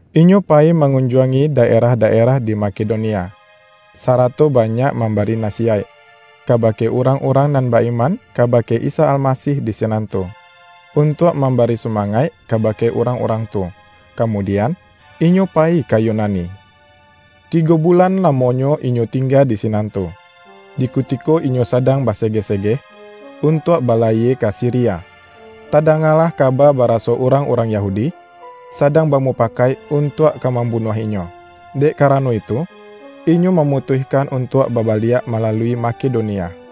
Inyo payi mangunjuangi daerah-daerah di Makedonia, sarato banyak mambari nasiyaik, kabake urang-urang nan ba-iman kabake Isa Almasih di sinan tu, untuak mambari sumangaik kabake urang-urang tu. Kamudian inyo payi ka Yunani. Tigo bulan lamonyo inyo tingga di sinan tu. Di kutiko inyo sadang basegeh-segeh, untuak balayie ka Siria, tadangalah kaba baraso urang-urang Yahudi, sadang bamupakaik untuak ka mambunuah inyo. Dek karano itu, inyo mamutuihkan untuak babaliak malalui Makedonia.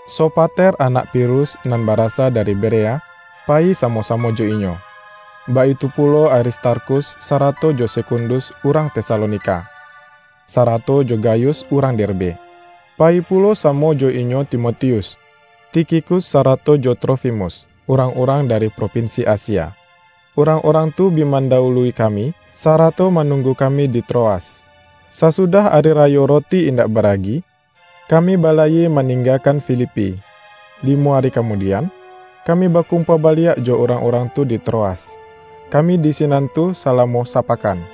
Sopater anak Pirus nan barasa dari Berea, payi samo-samo jo inyo; baitu pulo Aristarkhus sarato jo Sekundus urang Tesalonika, sarato jo Gayus urang Derbe. Payi pulo samo jo inyo Timotius, Tikhikus sarato jo Trofimus, urang-urang dari propinsi Asia. Urang-urang tu bi mandawului kami, sarato manunggu kami di Troas. Sasudah ari rayo Roti Indak Baragi, kami balayie maninggakan Filipi. Limo ari kamudian, kami bakumpua baliak jo urang-urang tu di Troas. Kami di sinan tu salamo sapakan.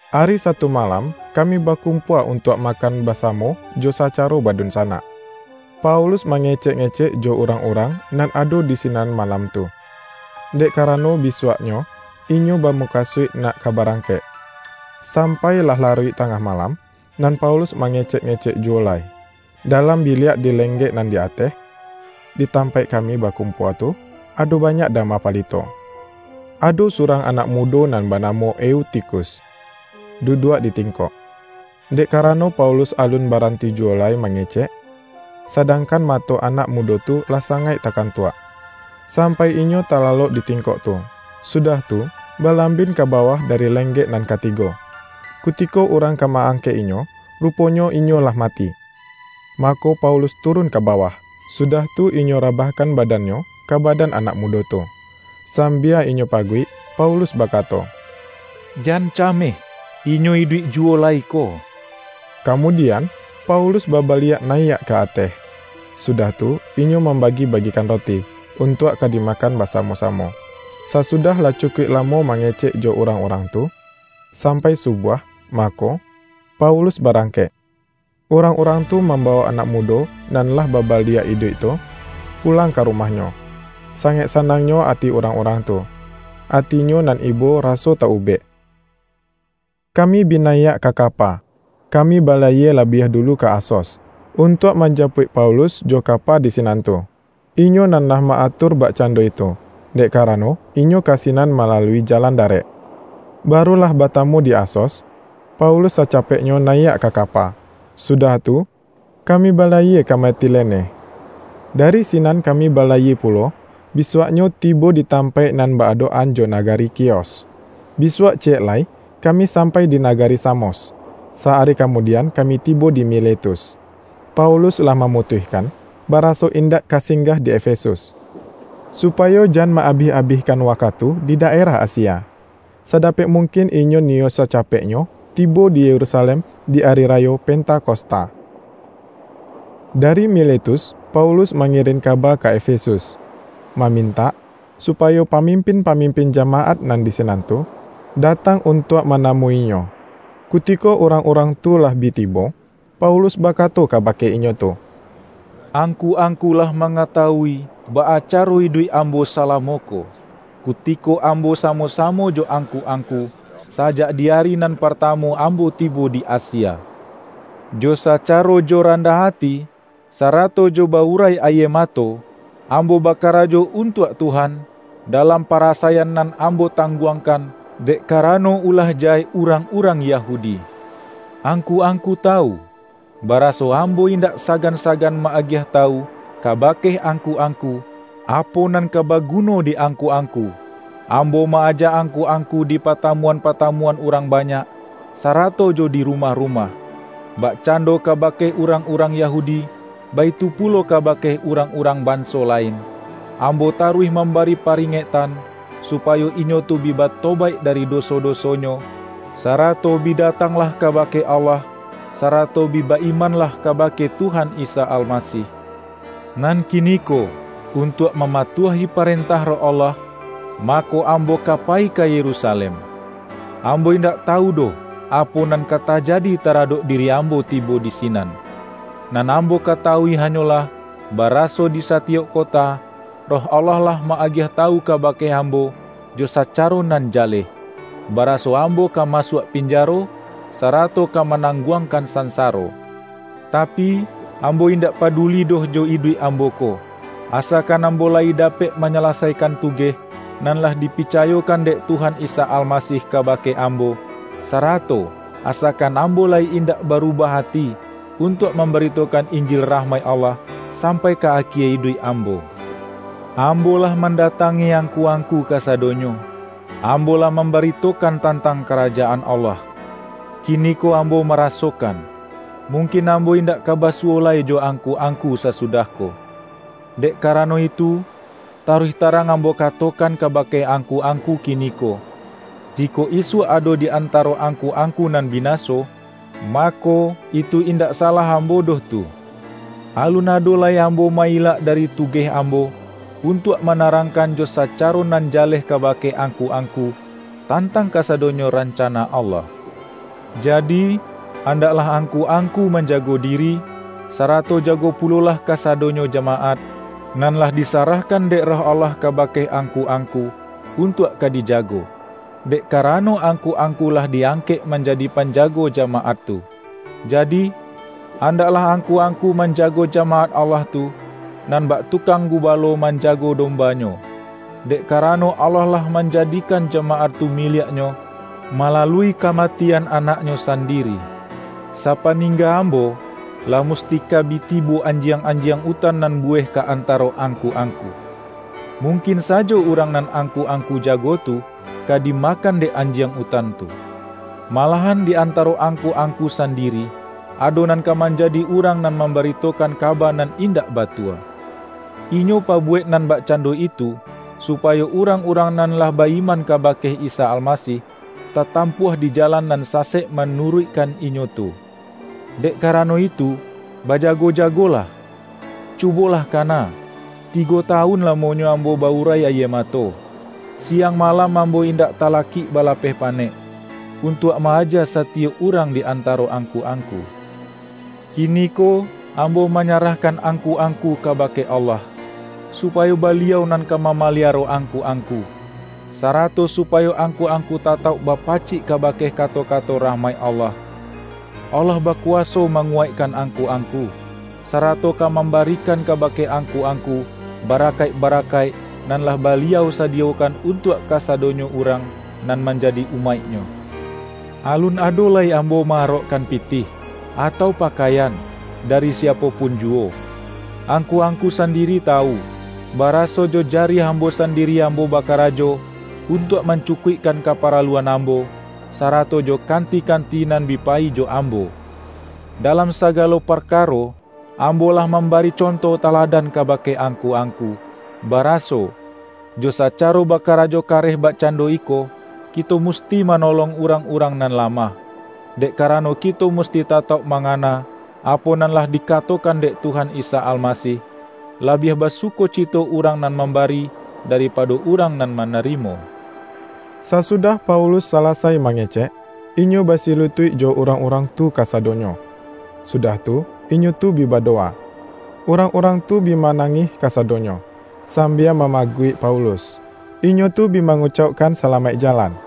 Ari Satu malam, kami bakumpua untuak makan basamo jo sacaro badunsanak. Paulus mangecek-ngecek jo urang-urang nan ado di sinan malam tu, dek karano bisuaknyo inyo bamukasuik nak ka barangkek. Sampai lah laruik tangah malam, nan Paulus mangecek-ngecek juwo lai. Dalam biliak di lenggek nan di ateh, di tampaik kami bakumpua tu, ado banyak dama palito. Ado surang anak mudo nan banamo Eutikhus, duduak di tingkok. Dek karano Paulus alun baranti juwo lai mangecek, sadangkan mato anak mudo tu lah sangaik takantuak, sampai inyo talalok di tingkok tu, sudah tu, balambin ka bawah dari lenggek nan katigo. Kutiko urang ka ma-angkek inyo, ruponyo inyo lah mati. Mako, Paulus turun ka bawah, sudah tu inyo rabahkan badannyo ka badan anak mudo tu, sambia inyo paguik. Paulus bakato,”Jan cameh, inyo iduik juwo lai ko!” Kamudian, Paulus babaliak nayiak ka ateh, sudah tu inyo mambagi-bagikan roti, untuak ka dimakan basamo-samo. Sasudah lah cukuik lamo mangecek jo urang-urang tu, sampai subuah, mako, Paulus barangkek. Urang-urang tu mambawok anak mudo, nan lah babaliak iduik tu, pulang ka rumahnyo. Sangaik sanangnyo ati urang-urang tu, atinyo nan ibo raso ta-ubek. Kami bi nayiak ka kapa, kami balayie labiah dulu ka Asos, untuak manjapuik Paulus jo kapa di sinan tu. Inyo nan lah ma-atur bakcando itu, dek karano inyo ka sinan malalui jalan darek. Baru lah batamu di Asos, Paulus sacapeknyo nayiak ka kapa, sudah tu kami balayie ka Metilene. Dari sinan kami balayie pulo, bisuaknyo tibo di tampaik nan ba-adok-an jo nagari Khios. Bisuak ciyek lai kami sampai di nagari Samos, sa-ari kamudian kami tibo di Miletus. Paulus lah mamutuihkan, baraso indak ka singgah di Efesus, supayo jan ma-abih-abihkan wakatu di daerah Asia. Sadapek mungkin inyo niyo sacapeknyo tibo di Yerusalem di Ari Rayo Pentakosta. Dari Miletus Paulus mangirin kaba ka Efesus, mamintak supayo pamimpin-pamimpin jamaat nan di sinan tu, datang untuak manamu-inyo. Kutiko urang-urang tu lah bi tibo, Paulus bakato kabake inyo tu,”Angku-angku lah mangatawui baa caro iduik ambo salamo ko, kutiko ambo samo-samo jo angku-angku, sajak di ari nan partamu ambo tibo di Asia. Jo sacaro jo randah ati, sarato jo ba-urai ayie mato, ambo bakarajo untuak Tuhan, dalam parasaian nan ambo tangguangkan, dek karano ulah jahek urang-urang Yahudi. Angku-angku tawu, baraso ambo indak sagan-sagan ma-agiah tawu kabake angku-angku, apo nan ka baguno di angku-angku. Ambo ma-aja angku-angku di patamuan-patamuan urang banyak, sarato jo di rumah-rumah. Bakcando kabake urang-urang Yahudi, baitu pulo kabake urang-urang banso lain, ambo taruih mambari paringektan, supayo inyo tu bi batobaik dari doso-dosonyo, sarato bi datanglah kabake Allah, sarato bi ba-imanlah kabake Tuhan Isa Almasih. Nan kiniko untuak mamatuahi parentah Roh Allah, mako, ambo ka payi ka Yerusalem. Ambo indak tawu doh, apo nan ka tajadi taradok diri ambo tibo di sinan. Nan ambo katawui hanyolah, baraso di satiyok kota, Roh Allah lah ma-agiah tawu kabake ambo jo sacaro nan jaleh, baraso ambo ka masuak pinjaro, sarato ka manangguangkan sansaro. Tapi, ambo indak paduli doh jo iduik ambo ko, asakan ambo layi dapek manyalasaikan tugeh, nan lah dipicayokan dek Tuhan Isa Almasih kabake ambo, sarato asakan ambo layi indak barubah ati, untuak mambaritokan Injil rahmaik Allah sampai ka akie iduik ambo. Ambo lah mandatangi angku-angku kasadonyo, ambo lah mambaritokan tantang Karajaan Allah. Kiniko ambo marasokan, mungkin ambo indak ka basuwo lai jo angku-angku sasudah ko. Dek karano itu, taruih tarang ambo katokan kabake angku-angku kiniko, jikok isuak ado di antaro angku-angku nan binaso, mako, itu indak salah ambo doh tu. Alun ado lai ambo ma-ilak dari tugeh ambo, untuak manarangkan jo sacaro nan jaleh kabake angku-angku, tantang kasadonyo rancana Allah. Jadi, andaklah angku-angku manjago diri, sarato jago pulolah kasadonyo jamaat, nan lah disarahkan dek Roh Allah kabake angku-angku, untuak ka dijago; dek karano angku-angku lah di-angkek manjadi panjago jamaat tu. Jadi, andaklah angku-angku manjago jamaat Allah tu, nan bak tukang gubalo manjago dombanyo, dek karano Allah lah manjadikan jamaat tu miliak-Nyo, malalui kamatian Anak-Nyo sandiri. Sapaningga ambo, lah musti ka bi tibo anjiang-anjiang utan nan buweh ka antaro angku-angku. Mungkin sajo urang nan angku-angku jago tu, ka dimakan dek anjiang utan tu. Malahan di antaro angku-angku sandiri, ado nan ka manjadi urang nan mambaritokan kaba nan indak batua. Inyo pabuwek nan bakcando itu, supayo urang-urang nan lah ba-iman kabake Isa Almasih, tatampuah di jalan nan sasek manuruikkan inyo tu. Dek karano itu, bajago-jagolah! Cubolah kana, tigo tawun lamonyo ambo ba-urai ayie mato, siang malam ambo indak talakik balapeh panek, untuak ma-aja satiyok urang di antaro angku-angku. Kiniko ambo manyarahkan angku-angku kabake Allah, supayo Baliau nan ka mamaliaro angku-angku, sarato supayo angku-angku tatauk bapacik kabake kato-kato rahmaik Allah. Allah bakuwaso manguwaikkan angku-angku, sarato ka mambarikan kabake angku-angku barakaik-barakaik, nan lah Baliau sadiyokan untuak kasadonyo urang nan manjadi umaik-Nyo. Alun ado lai ambo ma-arokkan pitih, atau pakaian, dari siapo pun juwo. Angku-angku sandiri tawu, baraso jo jariah ambo sandiri ambo bakarajo, untuak mancukuikkan kaparaluan ambo, sarato jo kanti-kanti nan bi payi jo ambo. Dalam sagalo parkaro ambo lah mambari conto taladan kabake angku-angku, baraso, jo sacaro bakarajo kareh bakcando iko, kito musti manolong urang-urang nan lamah. Dek karano kito musti tatauk mangana, apo nan lah dikatokan dek Tuhan Isa Almasih, ’Labiah basukocito urang nan mambari daripado urang nan manarimo.’” Sasudah Paulus salasai mangecek, inyo basilutuik jo urang-urang tu kasadonyo, sudah tu, inyo tu bi badowa. Urang-urang tu bi manangih kasadonyo, sambia mamaguik Paulus, inyo tu bi mangucaukkan salamaik jalan.